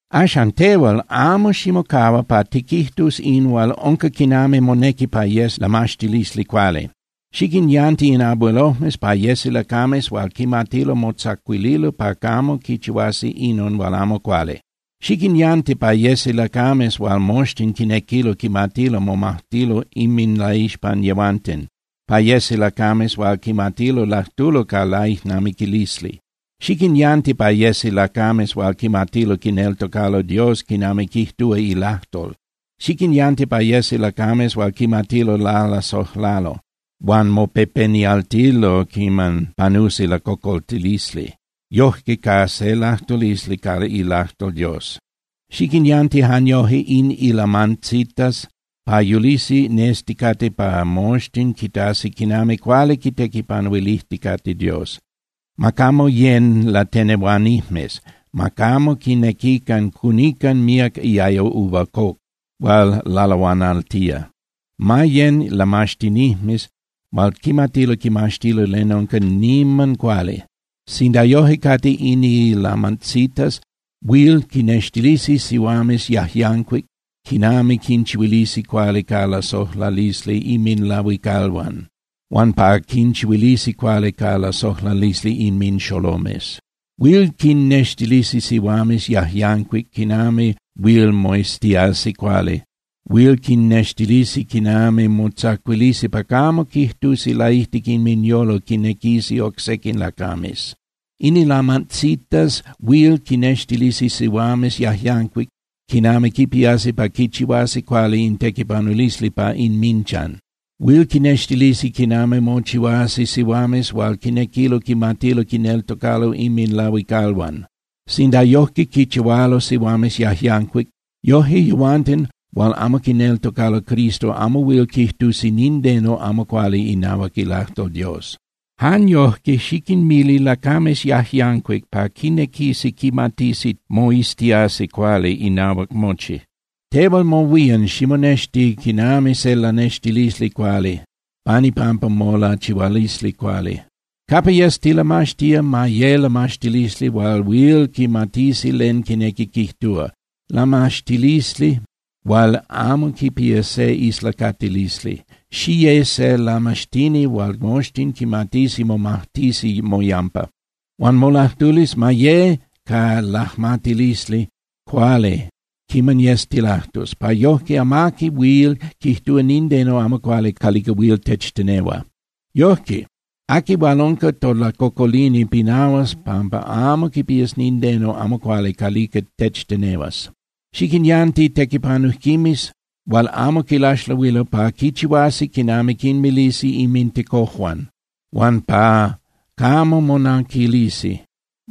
Axan, tehual, amo ximocahua pa tiquijtus in hual unca quinami monequi pa yes lamaxtilisli cuali. Xiquinyanti in abuelojmes pa yesi lacames hual quimatilo motzacuililo pa camo quichihuasi inon hual amo cuali. Xiquinyanti pa yesi lacames hual moxtin quinequilo quimatilo momajtilo inminlaixpan yehuanten, pa yesi lacames hual quimatilo lajtulo ca laijnamiquilisli. Xiquinyanti pa yesi lacames hual quimatilo quineltocalo Dios quinami quijtúa ilajtol. Xiquinyanti pa yesi lacames hual quimatilo lalasojlalo huan mopepenialtilo quiman panusi lacocoltilisli, yojque ca se lajtulisli ca ilajtol Dios. Xiquinyanti jan yoje in ilamantzitas pa yulisi nesticate pa moxtin quitasi quinami cuali quitequipanuilijticate Dios. Ma camo yén (yecan) latenehuanijmes, ma camo quinequican cunican míac iayo uva coc hual lalahuanaltía. Ma yén (yecan) lamaxtinijmes hual quimatilo quimaxtilo len unca niman cuali. Sinda yoje cate in ilamantzitas, huil quinnextilisi sihuames yajyancuic quinami quinchihuilisi cuali ca lasojlalisli inminlahuicalhuan, huan pa quinchihuilisi cuali ca lasojlalisli inminxolomes. Huil quinnextilisi sihuames yajyancuic quinami huil moiztiasi cuali, huil quinnextilisi quinami motzacuilisi pa camo quijtusi laijtic inminyolo quinequisi oc sequin lacames. In ilamantzitas huil quinnextilisi sihuames yajyancuic quinami quipiasi pa quichihuasi cuali in tequipanulisli pa inminchan. Huil quinnextilisi quinami mochihuasi sihuames hual quinequilo quimatilo quinneltocalo inminlahuicalhuan. Sinda yojque quichihualo sihuames yajyancuic, yoje yehuanten hual amo quineltocalo Cristo amo huil quijtusi nindeno amo cuali inahuac ilajtol Dios. Jan yojque, xiquinmili lacames yajyancuic pa quinequisi quimatisi moiztiasi cuali inahuac mochi. Tehual mohuían, ximonexti quinami se lanextilisli cuali pan ipampa molachihualisli cuali. Capa yes tilamaxtía, ma ye lamaxtilisli hual huil quimatisi len quinequi quijtúa, lamaxtilisli hual amo quipía se islacatilisli. Xiye se lamaxtini hual moxtin quimatisi momajtisi moyampa. Huan molajtulisli ma ye ca lajmatilisli cuali quiman yes tilajtus, pa yojque amaqui huil quijtúa nindeno amo cuali calica huil techtenehua. Yojque, aqui hual unca tolacocolini pinahuas pampa amo quipías nindeno amo cuali calica techtenehuas. Xiquinyanti tequipanujquimes hual amo quilaxlahuilo pa quichihuasi quinami quinmilisi inmintecojuan huan pa camo monanquilisi.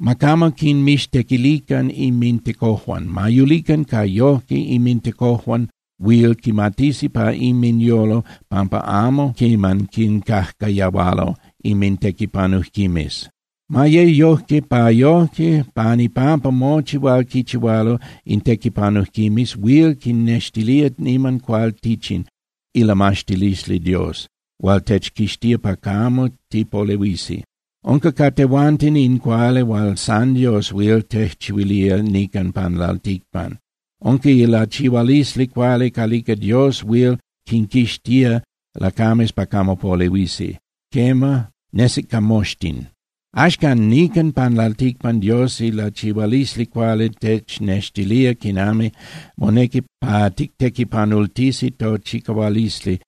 Ma camo quinmixtequilican inmintecojuan. Ma yulican pa yojque inmintecojuan huil quimatisi pa inminyolo pampa amo quiman quincajcayahualo inmintequipanujquimes. Ma ye yojque pa yojque pan ipampa mochi hual quichihualo in tequipanujquimes huil quinnextilía niman cualtichin ilamaxtilisli Dios hual techquixtía pa camo tipolehuisi. Unca ca tehuanten in cuali hual san Dios huil tejchihuilía nican pan lalticpan. Unca ilachihualisli cuali calica Dios huil quinquixtía lacames pa camo polehuisi. Quema, nesic ca moxtin. Axcan nican pan lalticpan Dios ilachihualisli cuali technextilía quinami monequi pa tictequipanultisi tochicahualisli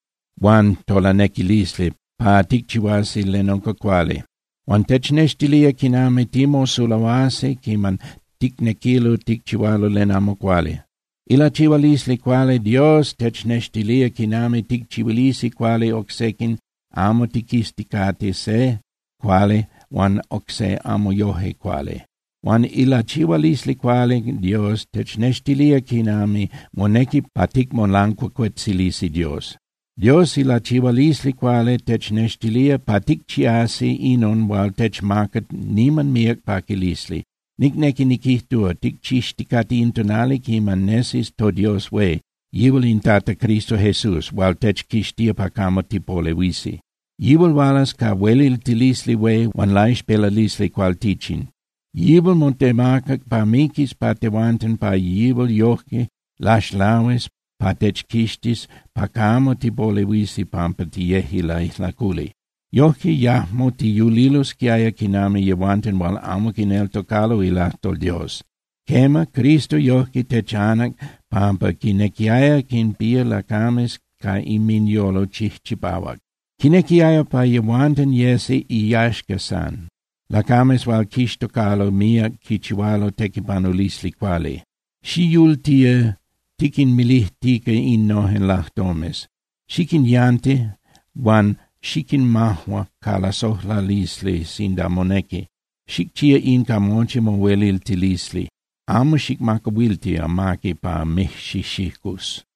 huan tolanequilisli pa ticchihuasi len unca cuali. Huan technextilía quinami timosulahuasi quiman ticnequilo ticchihualo len amo cuali. Ilachihualisli cuali Dios technextilía quinami ticchihuilisi cuali oc sequin, amo tiquizticate se cuali huan oc se amo yoje cuali. Huan ilachihualisli cuali Dios technextilía quinami monequi pa ticmolancuacuetzilisi Dios. Dios ilachihualisli cuali technextilía pa ticchiasi inon hual techmaca niman míac paquilisli. Nicnequi niquijtúa, ticchixticate in tonali quiman nesis toDios hué, yihual in Tata Cristo Jesús hual techquixtía pa camo tipolehuisi. Yihual hualas ca hueliltilisli hué huan laixpelalisli cualtichin. Yihual motemacac pa miquis pa tehuanten pa yihual yojque laxlahuis pa techquixtis pa camo tipolehuisi pampa tiyeje laijlaculi. Yojque yajmo tiyulilosquiaya quinami yehuanten hual amo quineltocalo ilajtol Dios. Quema, Cristo yojque techanac pampa quinequiaya quinpía lacames ca inminyolo chijchipahuac. Quinequiaya pa yehuanten yesi iyaxca san, lacames hual quixtocalo míac quichihualo tequipanulisli cuali. Xiyultía tiquinmilijtica innojen lajtomes. Xiquinyanti huan xiquinmajua ca lasojlalisli sinda monequi, xicchía in ca mochi mohueliltilisli. Amo xicmacahuilti amaqui pa mijxijxicus.